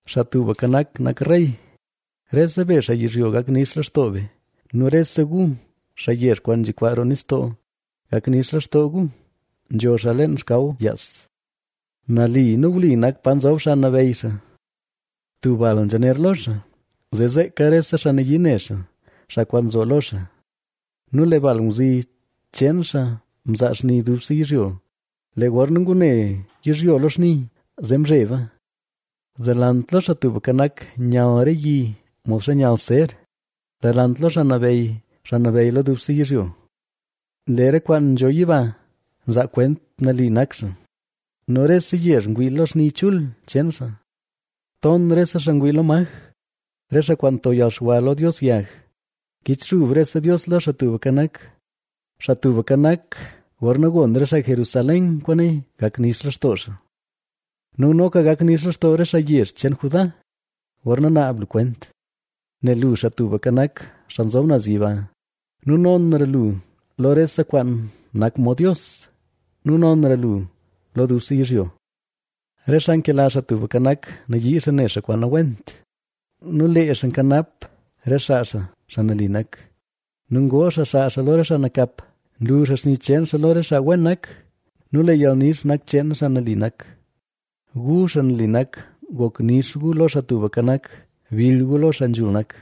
¡Xaa Tubka Nak, nak rey! ¡Rese be xaa yizhyo, gak nix lextoo be! ¡Nu rese gu, xaa yezh kwaan nzhikwaa roo nistoo, gak nix lextoo gu! Nzho xaa leen xkaw yaas; nali nu wli nak pa nzob xaa nabeyy xaa. Tub bal nzhaner lo xaa, zee zeeka re xaa nayii ne xaa, xaa kwaan nzo lo xaa. Nu lee bal ngwzi cheen xaa mzaa xni dubse yizhyo; lee gorna ngune yizhyo lo xni, zee mzheba. Delant lo Xaa Tubka Nak, nyall re yi modxa nyall ser, delant lo Xaa Nabeyy, xaa nabeyy lo dubse yizhyo. Lee re kwaan nzho yiba nzaa kwent nali nak xaa nu rese yezh ngwii lo xni chul cheen xaa. Ton rese xaa ngwii lo maj, re xaa kwaan nto yalxwa lo dios yag, kichxub rese dios lo Xaa Tubka Nak. Xaa Tubka Nak, gorna gon re xaa Jerusalén kwaane, gak nix lextoo xaa nu noka gak nix lextoo re xaa yezh cheen Judá, gorna naab lu kwent. Nel lu, Xaa Tubka Nak, Xaa Nzob Naz Yiba, nu nonra lu lo rese kwaan nak mod dios nu nonra lu lo dubse yizhyo. Re xaa nkela Xaa Tubka Nak, nayii xaa ne xaa kwaan nawent nu lee xaa nkanap re xaa xaa, xaa nali nak nu ngoo xaa xaa lo re xaa nakap. Nlu xaa xni cheen xaa lo re xaa wen nak nu lee yalnix nak cheen xaa nali nak. Gu, xaa nali nak, gok nix gu lo Xaa Tubka Nak, bill gu lo xaa nzhul nak.